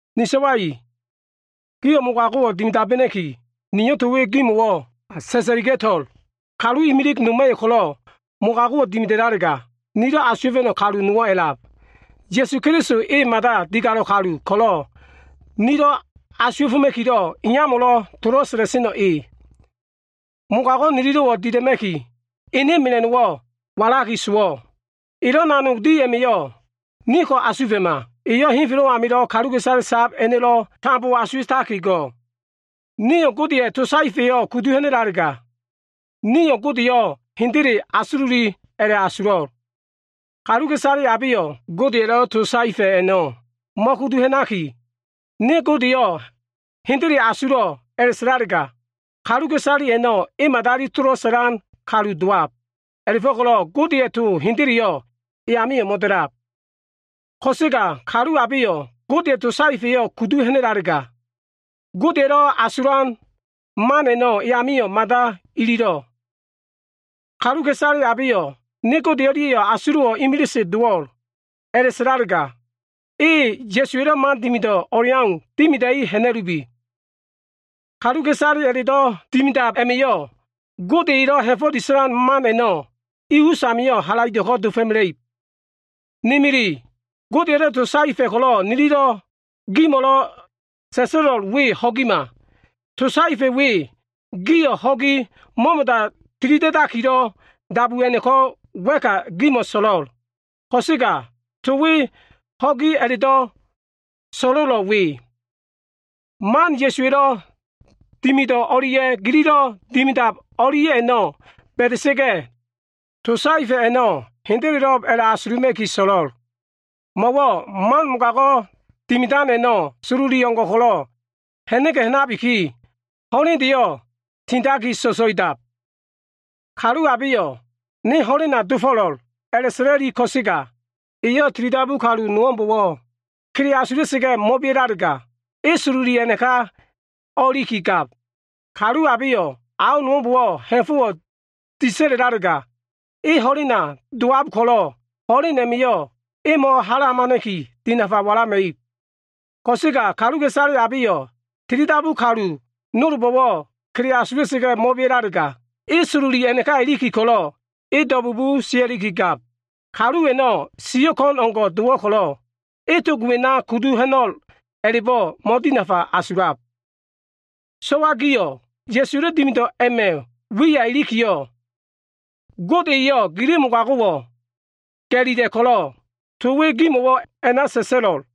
Ni so꞉wa i, gio꞉ mogago꞉wo꞉ dimidabena꞉ki, niyo꞉ to we gimo꞉ sa꞉sa꞉liga꞉to꞉l. Kalu imilig noma꞉yo꞉ ko꞉lo꞉ mogago꞉wo꞉ dimidalega, nilo꞉ asuwa꞉fa꞉no꞉ kalu nowo꞉ a꞉lab. Ya꞉su Keliso, e mada digalo꞉ kalu ko꞉lo꞉ nilo꞉ asuwa꞉foma꞉kilo꞉, Iyamo꞉lo꞉ tolo꞉ sa꞉la꞉seno꞉ e. Mogago꞉ nililo꞉wo꞉ dila꞉ma꞉ki, ene mela꞉no꞉wo꞉ walaki sowo꞉. Elo꞉ nanog di a꞉ma꞉yo꞉ niko꞉ asufa꞉ma, eyo꞉ henfelo꞉ amilo꞉ kaluka꞉isale sab a꞉no꞉lo꞉ tambo asuwa꞉taki go꞉. Nio꞉ Godeya꞉ to saefa꞉yo꞉ kudu ha꞉na꞉lalega, nio꞉ Godeyo꞉ hendele asululi a꞉la꞉asulo꞉l. Kaluka꞉isale abeyo꞉ Godeya꞉lo꞉ to saefa꞉ a꞉no꞉ mo꞉kudu ha꞉naki, “Ne Godeyo꞉ hendele asulo꞉” a꞉la꞉sa꞉lalega, kaluka꞉isale a꞉no꞉ e madali tolo꞉ sa꞉lan kalu dowab. A꞉la꞉fo꞉ko꞉lo꞉ Godeya꞉ to hendeleyo꞉ e amio꞉ mo꞉da꞉lab. Ko꞉sega kalu abeyo꞉ Godeya꞉ to saefa꞉yo꞉ kudu ha꞉na꞉lalega, Godeya꞉lo꞉ asulan man a꞉no꞉ e amio꞉ mada ililo꞉. Kaluka꞉isale abeyo꞉ “Ne Gode o꞉lia꞉yo꞉ asulo꞉wo꞉ imilise dowo꞉l,” a꞉la꞉sa꞉lalega, e Ya꞉suwa꞉lo꞉ man dimido꞉ o꞉leau dimida꞉i ha꞉na꞉lubi. Kaluka꞉isale a꞉la꞉do꞉ dimidab a꞉ma꞉yo꞉, Gode elo꞉ ha꞉fo꞉ disa꞉lan man a꞉no꞉ i usamio꞉ halaido꞉ko꞉ dofo꞉mela꞉ib. Ne mili, Godeya꞉lo꞉ to saefa꞉ ko꞉lo꞉ nilo꞉ gimo꞉lo꞉ sa꞉sa꞉lo꞉l we, ho꞉gima. To saefa꞉ we, gio꞉ ho꞉gi mo꞉mo꞉da tilida꞉dakilo꞉ dabu a꞉no꞉ko꞉ wa꞉ka gimo꞉ so꞉lo꞉l. Ko꞉sega to we ho꞉gi a꞉la꞉do꞉ so꞉lo꞉lo꞉ we. Man Ya꞉suwa꞉lo꞉ dimido꞉ o꞉lia꞉ gililo꞉ dimidab o꞉lia꞉ a꞉no꞉ ba꞉da꞉sa꞉ga꞉, to saefa꞉ a꞉no꞉ hendelelo꞉b a꞉la꞉asuluma꞉ki so꞉lo꞉l. Mo꞉wo꞉ man mogago꞉ dimidan a꞉no꞉ sololi o꞉ngo꞉ ko꞉lo꞉ ha꞉na꞉ga꞉ ha꞉nabiki, ho꞉lendeyo꞉ tindaki so꞉so꞉idab. Kalu abeyo꞉, “Ne ho꞉lena dofo꞉lo꞉l,” a꞉la꞉sa꞉la꞉liki ko꞉sega eyo꞉ tilidabu kalu nowo꞉mbo꞉wo꞉ kele asulaki mo꞉bea꞉lalega, e sololi a꞉naka o꞉ilikigab. Kalu abeyo꞉ ao nowo꞉mbo꞉wo꞉ ha꞉fo꞉wo꞉ disa꞉lalega, e ho꞉lena dowab ko꞉lo꞉ ho꞉len a꞉ma꞉yo꞉ e mo꞉hala hamana꞉ki, dinafa walama꞉ib. Ko꞉sega kaluka꞉isale abeyo꞉ tilidabu kalu nolbo꞉wo꞉ kele asulaki mo꞉bea꞉lalega, e sololi a꞉naka iliki ko꞉lo꞉ e do꞉bugu sia꞉likigab. Kalu a꞉no꞉ siyo꞉ ko꞉n o꞉ngo꞉ dowo꞉ ko꞉lo꞉, e tog a꞉na kudu ho꞉no꞉l a꞉la꞉bo꞉ mo꞉dinafa asulab. So꞉wa gio꞉, Ya꞉suwa꞉lo꞉ dimido꞉ a꞉ma꞉ wiya ilikiyo꞉ Gode eyo꞉ gili mogago꞉wo꞉ ga꞉lila꞉ ko꞉lo꞉, to we gimo꞉wo꞉ a꞉na sa꞉sa꞉lo꞉l.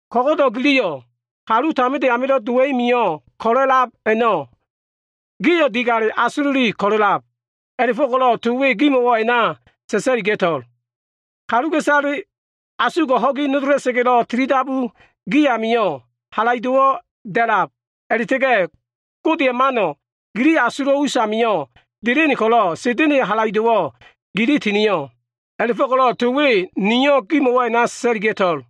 Ko꞉go꞉do꞉ giliyo꞉, kalu taminde amilo꞉ dowa꞉i mio꞉ ko꞉lo꞉ a꞉lab a꞉no꞉, gio꞉ digale asululi ko꞉lo꞉lab. A꞉la꞉fo꞉ko꞉lo꞉ to we gimo꞉wo꞉ a꞉na sa꞉sa꞉liga꞉to꞉l. Kaluka꞉isale asugo꞉ ho꞉gi nodola꞉sa꞉ga꞉lo꞉ tilidabu gi amio꞉, halaido꞉wo꞉ da꞉lab a꞉la꞉ta꞉ga꞉, Godeya꞉ mano꞉ gili asulo꞉ usamio꞉ delen ko꞉lo꞉, mogago꞉lelo꞉ dimida꞉sen Sa꞉da꞉na꞉ e gili tinio꞉. A꞉la꞉fo꞉ko꞉lo꞉ to we niyo꞉ gimo꞉wo꞉ a꞉na sa꞉sa꞉liga꞉to꞉l.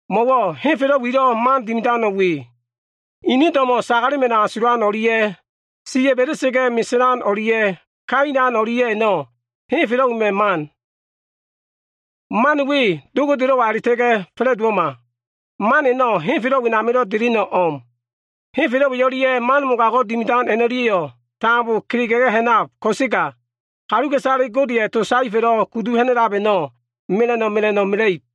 Mo꞉wo꞉ henfelo꞉ wilo꞉ man dimidano꞉ we. Ini do꞉mo꞉ sagalema꞉no꞉ asulan o꞉lia꞉, siya꞉ ba꞉da꞉sa꞉ga꞉ meselan o꞉lia꞉ kailan o꞉lia꞉ a꞉no꞉, henfelo꞉ wema꞉ man. Man we Do Godelo꞉wa a꞉la꞉ta꞉ga꞉ fa꞉la꞉dowo꞉ma. Man a꞉no꞉ henfelo꞉ wenamilo꞉ deleno꞉ o꞉m. Henfelo꞉ we o꞉lia꞉ man mogago꞉ dimidan a꞉no꞉lia꞉yo꞉ tambo kelega꞉ga꞉ ha꞉nab ko꞉sega, kaluka꞉isale Godeya꞉ to saefa꞉lo꞉ kudu ha꞉na꞉lab a꞉no꞉ mela꞉no꞉ mela꞉no꞉ mela꞉ib.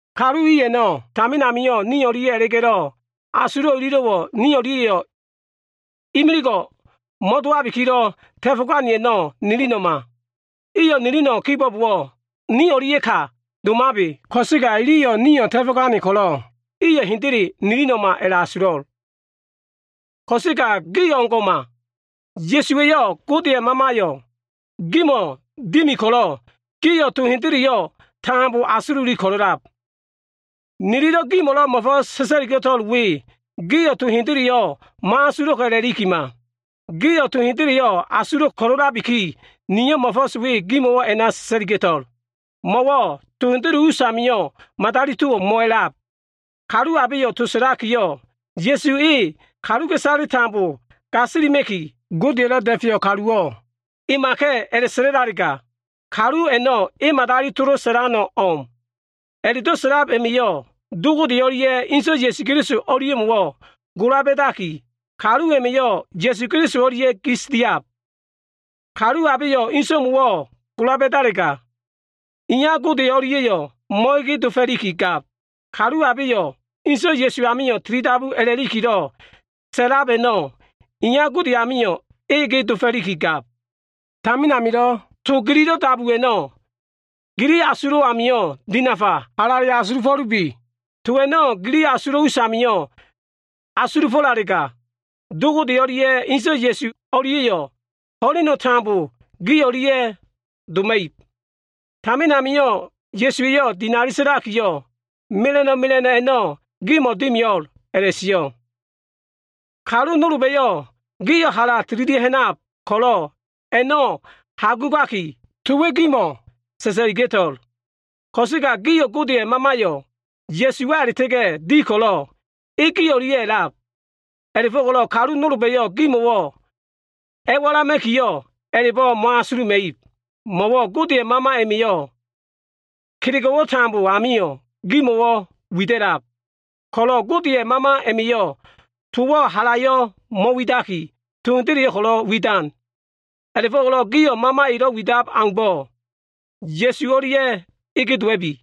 Kalu i a꞉no꞉ tamin amio꞉ ni o꞉lia꞉ a꞉la꞉ga꞉lo꞉, asulo꞉ ililo꞉wo꞉ ni o꞉lia꞉yo꞉ imiligo꞉ mo꞉dowabikilo꞉ ta꞉fo꞉gane a꞉no꞉ nilino꞉ma. Iyo꞉ nilino꞉ kibo꞉bowo꞉, ni o꞉lia꞉ka o꞉domabe. Ko꞉sega iliyo꞉ nio꞉ ta꞉fo꞉gane ko꞉lo꞉ iyo꞉ hendele nilino꞉ma a꞉la꞉asulo꞉. Ko꞉sega gio꞉ o꞉ngo꞉ma. Ya꞉suwa꞉yo꞉ Godeya꞉ Mamayo꞉ gimo꞉ dimi ko꞉lo꞉ gio꞉ to hendeleyo꞉ tambo asululi ko꞉lo꞉lab. Nilo꞉ gimo꞉lo꞉ mo꞉fo꞉s sa꞉sa꞉liga꞉to꞉l we, gio꞉ to hendeleyo꞉ mo꞉asulo꞉ a꞉la꞉likima. Gio꞉ to hendeleyo꞉ asulo꞉ ko꞉lo꞉labiki, niyo꞉ mo꞉fo꞉s we gimo꞉wo꞉ a꞉na sa꞉sa꞉liga꞉to꞉l. Mo꞉wo꞉ to hendele us amio꞉ madali towo꞉ mo꞉alab. Kalu abeyo꞉ to sa꞉lakiyo꞉, “Ya꞉su e, kaluka꞉isaleyo꞉ tambo gasilima꞉kilo꞉ Godeya꞉lo꞉ da꞉feyo꞉ kaluwo꞉, emaka꞉” a꞉la꞉sa꞉la꞉lalega, kalu a꞉no꞉ e madali tolo꞉ sa꞉lano꞉ o꞉m. A꞉la꞉do꞉ sa꞉lab a꞉ma꞉yo꞉, Do Gode o꞉lia꞉ Inso꞉ Ya꞉su o꞉lia꞉mo꞉wo꞉ gola ba꞉daki, kalu a꞉ma꞉yo꞉ Ya꞉su Keliso o꞉lia꞉ gis diab. Kalu abeyo꞉ Inso꞉mo꞉wo꞉ gola ba꞉dalega, Iya Gode o꞉lia꞉yo꞉ mo꞉dowo꞉ ko꞉lo꞉ gab. Kalu abeyo꞉ Inso꞉ Ya꞉su amio꞉ tilidabu a꞉la꞉likilo꞉ sa꞉lab a꞉no꞉, Iya Gode amio꞉ e dowakigab. Tamin amilo꞉ to gililo꞉ dabu a꞉no꞉, gili asulo꞉ amio꞉ dinafa halale asulufo꞉lubi. To a꞉no꞉ gili asulo꞉ usamio꞉ asulufo꞉lalega, Do Gode o꞉lia꞉ Inso꞉ Ya꞉su o꞉lia꞉yo꞉ ho꞉leno꞉ tambo gi o꞉lia꞉ doma꞉ib. Tamin amio꞉ Ya꞉suwa꞉yo꞉ dinali sa꞉lakiyo꞉, “mela꞉no꞉ mela꞉no꞉ a꞉no꞉ gimo꞉ dimio꞉l” a꞉la꞉sio꞉. Kalu nolba꞉yo꞉ gio꞉ hala tililia꞉ ha꞉nab ko꞉lo꞉ a꞉no꞉ hagugaki to we gimo꞉wo꞉ sa꞉sa꞉liga꞉to꞉l. Ko꞉sega gio꞉ Godeya꞉ Mamayo꞉ Ya꞉suwa a꞉la꞉ta꞉ga꞉ di ko꞉lo꞉, e gi o꞉lia꞉ a꞉lab. A꞉la꞉fo꞉ko꞉lo꞉ kalu nolba꞉yo꞉ gimo꞉wo꞉ a꞉walama꞉ki, a꞉la꞉bo꞉ mo꞉asuluma꞉ib. Mo꞉wo꞉ Godeya꞉ Mama a꞉ma꞉yo꞉ kelego꞉wo꞉ tambo ami gimo꞉wo꞉ wida꞉lab ko꞉lo꞉, Godeya꞉ Mama a꞉ma꞉yo꞉ towo꞉ halayo꞉ mo꞉widaki, to hendeleyo꞉ ko꞉lo꞉ wida꞉lab. A꞉la꞉fo꞉ko꞉lo꞉ gio꞉ Mama elo꞉ widab au, Ya꞉su e o꞉lia꞉ kegene dowa꞉bi.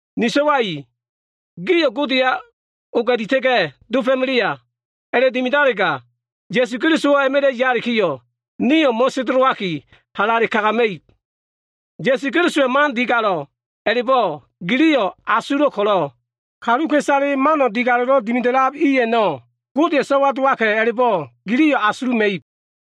Ni so꞉wa i, gio꞉ Godeya oga꞉dita꞉ga꞉ dofo꞉melea. A꞉la꞉dimidalega, Ya꞉su Kelisowo꞉ a꞉ma꞉la꞉ yalikiyo꞉, nio꞉ mo꞉sendelowaki, halaido꞉ kagama꞉ib. Ya꞉su Kelisowa꞉ mano꞉ digalo꞉ a꞉la꞉bo꞉ giliyo꞉ asulo꞉ ko꞉lo꞉, kaluka꞉isale mano꞉ digalo꞉lo꞉ dimida꞉lab i a꞉no꞉, Godeya꞉ so꞉wa dowaka꞉ a꞉la꞉bo꞉, giliyo꞉ asuluma꞉ib.